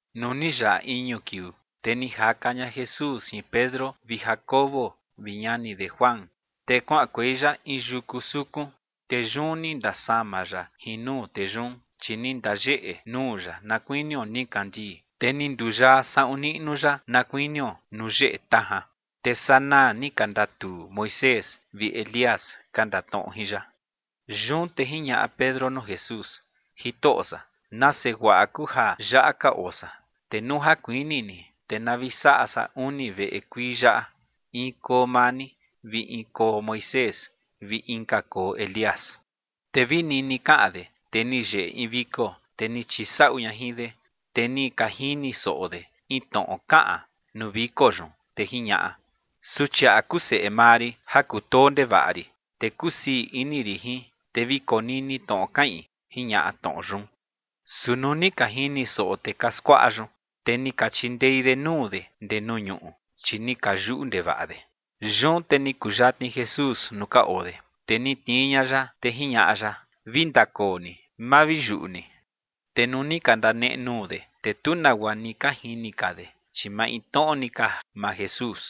Nuu ni yaꞌa iñu kiuu, te ni jaka ña Jesús jin Pedro vi Jacobo vi ñani de Juan, te kuaꞌankuei ya in yuku sukun. Te yun ni ndasama ya jin nuu tee yun, chi ni ndayeꞌe nuu ya na kuinio nikandii, te ni nduyaa saꞌun niꞌnu ya na kuinio nuu yeꞌe tajan. Te sanaa ni ka ndatuu Moisés vi Elías ka ndatnoꞌo jin ya. Yun te jiñaꞌa Pedro nuu Jesús: ͏―͏Jitoꞌo san, nase guaꞌa kuu ja yaꞌa ka oo san. Te nuu ja kuini ni, te na vi saꞌa san uni veꞌe kuii yaꞌa, in koo maa ni, vi in koo Moisés, vi inka koo Elías. Te vi nini kaꞌan de, te ni yeꞌe in viko, te ni chisaꞌu ña jin de, te ni ka jini soꞌo de in tnoꞌo kaꞌan nuu viko yun, te jiñaꞌa: ͏―͏Suchiaꞌa kuu seꞌe maa rin ja kutoo ndevaꞌa rin, te kusii ini rin jin. Te vi konini tnoꞌo kaꞌin ͏―͏jiñaꞌa tnoꞌo yun. Su nuu ni ka jini soꞌo tee ka skuaꞌa yun, te ni ka chindei de nuu de ndee nuu ñuꞌu, chi ni ka yuꞌu ndevaꞌa de. Yun te ni kuyatni Jesús nuu ka oo de, te ni tnii ña ya, te jiñaꞌa ya: ͏―͏Vi ndakoo ni, ma vi yuꞌu ni. Te nuu ni ka ndaneꞌe nuu de, te tu nagua ni ka jini ka de, chi maintnoꞌo ni ka maa Jesús.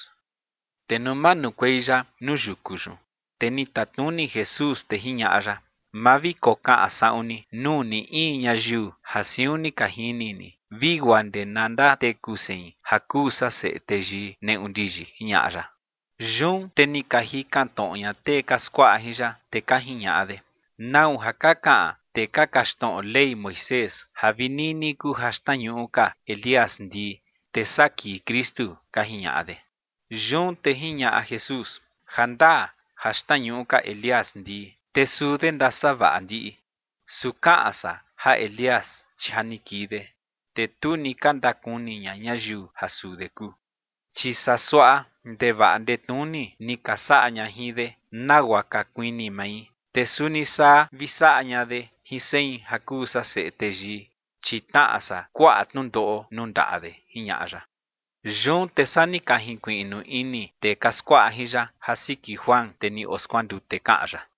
Te nuu manukuei ya nuu yuku yun, te ni tatnuni Jesús, te jiñaꞌa ya: ͏―͏Ma vi kokaꞌan saꞌun ni nuu ni in ñayiu ja siun ni ka jini ni vi guaa ndee na ndateku sein ja kuu san Seꞌe Teyii neꞌu ndiyi ͏―͏jiñaꞌa ya. Yun te ni ka jikan tnoꞌo ña tee ka skuaꞌa jin ya, te ka jiñaꞌa de: ͏―͏¿Nau ja ka kaꞌan tee ka kaxtnoꞌo Ley Moisés ja vi nini kuu ja xtnañuꞌu ka Elías ndii, te saa kii Kristu? ͏―͏ka jiñaꞌa de. Yun te jiñaꞌa Jesús: ͏―͏Ja ndaa ja xtnañuꞌu ka Elías ndii, te suu de ndasavaꞌa ndiꞌi. Su kaꞌan san ja Elías, chi ja ni kii de, te tu ni ka ndakuni ña ñayiu ja suu de kuu. Chi saa suaꞌa ndevaꞌa ndetnuni ni ka saꞌa ña jin de, nagua ka kuini mai. Te suni saa vi saꞌa ña de jin sein ja kuu san Seꞌe Teyii, chi tnaꞌa san kuaꞌa tnundoꞌo nuu ndaꞌa de ͏―͏jiñaꞌa ya. Yun te saa ni ka jinkuiꞌnu ini tee ka skuaꞌa jin ya ja siki Juan, tee ni oskuandute, kaꞌan ya.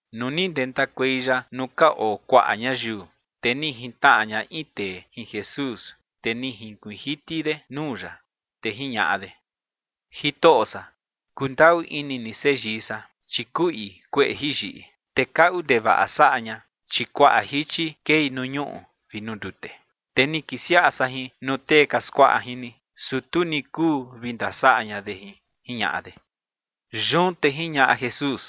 Nuu ni ndentakuei ya nuu ka oo kuaꞌa ñayiu, te ni jintnaꞌa ña in tee jin Jesús, te ni jinkuiin jiti de nuu ya, te jiñaꞌa de: ͏―͏Jitoꞌo san, kundaꞌu ini ni seyii san, chi kuꞌi kueꞌe jiyiꞌi, te kaꞌu ndevaꞌa saꞌa ña, chi kuaꞌa jichi kei nuu ñuꞌu vi nuu ndute. Te ni kisiaꞌa san jin nuu tee ka skuaꞌa jin ni, su tu ni kuu vi ndasaꞌa ña de jin ͏―͏jiñaꞌa de. Yun te jiñaꞌa Jesús: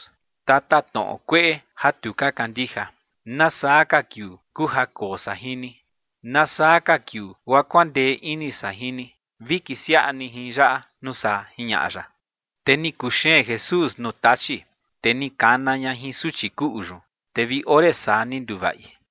͏―͏Tatatnoꞌo kueꞌe ja tu ka kandija, ¿nasaa ka kiuu kuu ja koo san jin ni? ¿Nasaa ka kiuu guaa kuandee ini san jin ni? Vi kisiaꞌa ni jin yaꞌa nuu saa ͏―͏jiñaꞌa ya. Te ni kuxeen Jesús nuu tachi, te ni kana ña jin suchi kuꞌu yun, te vi ore saa ni nduvaꞌi.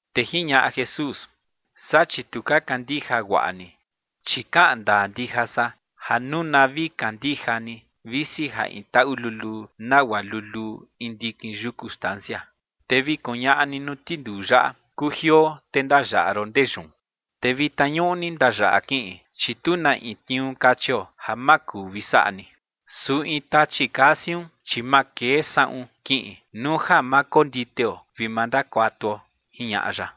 Te jiñaꞌa Jesús: ͏―͏Saa chi tu ka kandija guaꞌa ni. Chi kaꞌan ndaa ndija san ja nuu na vi kandija ni visi ja in taꞌu luluu nagua luluu in ndikin yuku stancia, te vi kuñaꞌa ni nuu tinduu yaꞌa: “Kujioo te ndayaꞌa ron ndee yun”, te vitna ñuꞌni ndayaꞌa kiꞌin. Chi tu na in tniuu kachio ja ma kuu vi saꞌa ni. Su in tachi kaa siun, chi ma kee saꞌun kiꞌin nuu ja ma konditeo vi ma ndakuatuo ͏―͏jiñaꞌa ya.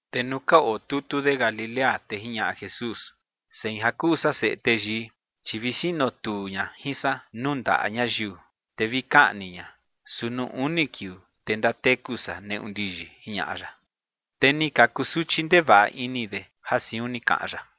Te nuu ka otutu de Galilea, te jiñaꞌa Jesús: ͏―͏Sein, ja kuu san Seꞌe Teyii, chi vi sinotuu ña jin san nuu ndaꞌa ñayiu te vi kaꞌni ña, su nuu uni kiuu, te ndateku san neꞌu ndiyi ͏―͏jiñaꞌa ya. Te ni ka kusuchi ndevaꞌa ini de ja siun ni kaꞌan ya.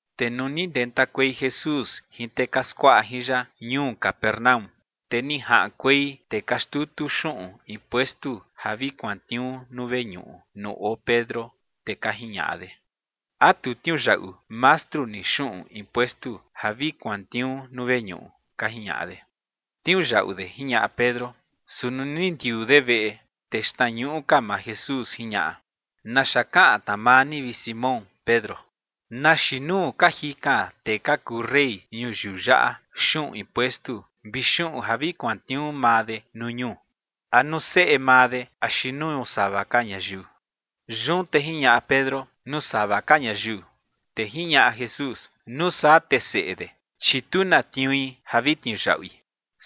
Te nuu ni ndentakuei Jesús jin tee ka skuaꞌa jin ya ñuu Capernaúm, te ni jaꞌankuei tee ka xtutu xuꞌun impuestu ja vi kuantniuu nuu veñuꞌu nuu oo Pedro, te ka jiñaꞌa de: ͏―͏¿A tu tniuyaꞌu mastru ni xuꞌun impuestu ja vi kuantniuu nuu veñuꞌu? ͏―͏ka jiñaꞌa de. ͏―͏Tniuyaꞌu de ͏―͏jiñaꞌa Pedro. Su nuu ni ndiuu de veꞌe, te xtnañuꞌu ka maa Jesús jiñaꞌa: ͏―͏¿Naxa kaꞌan tna maa ni, vi Simón Pedro? ¿Na xiin nuu ka jikan tee ka kuu rey ñuyiu yaꞌa xuꞌun impuestu vi xuꞌun ja vi kuantniuu maa de nuu ñuu? ¿A nuu seꞌe maa de axi nuu sava ka ñayiu? Yun te jiñaꞌa Pedro: ͏―͏Nuu sava ka ñayiu. Te jiñaꞌa Jesús: ͏―͏Nuu saa te seꞌe de, chi tu na tniui ja vi tniuyaꞌui.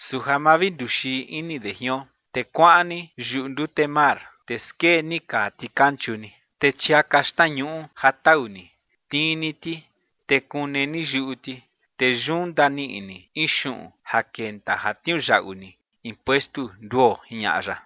Su ja ma vi nduxii ini de jion, te kuaꞌan ni yuꞌu ndute mar, te skee ni kaa tikanchu ni, te chiaka xtnañuꞌu ja tau ni, tnii ni ti, te kune ni yuꞌu ti, te yun ndaniꞌi ni in xuꞌun ja kenta ja tniuyaꞌu ni impuestu nduo ͏―͏jiñaꞌa ya.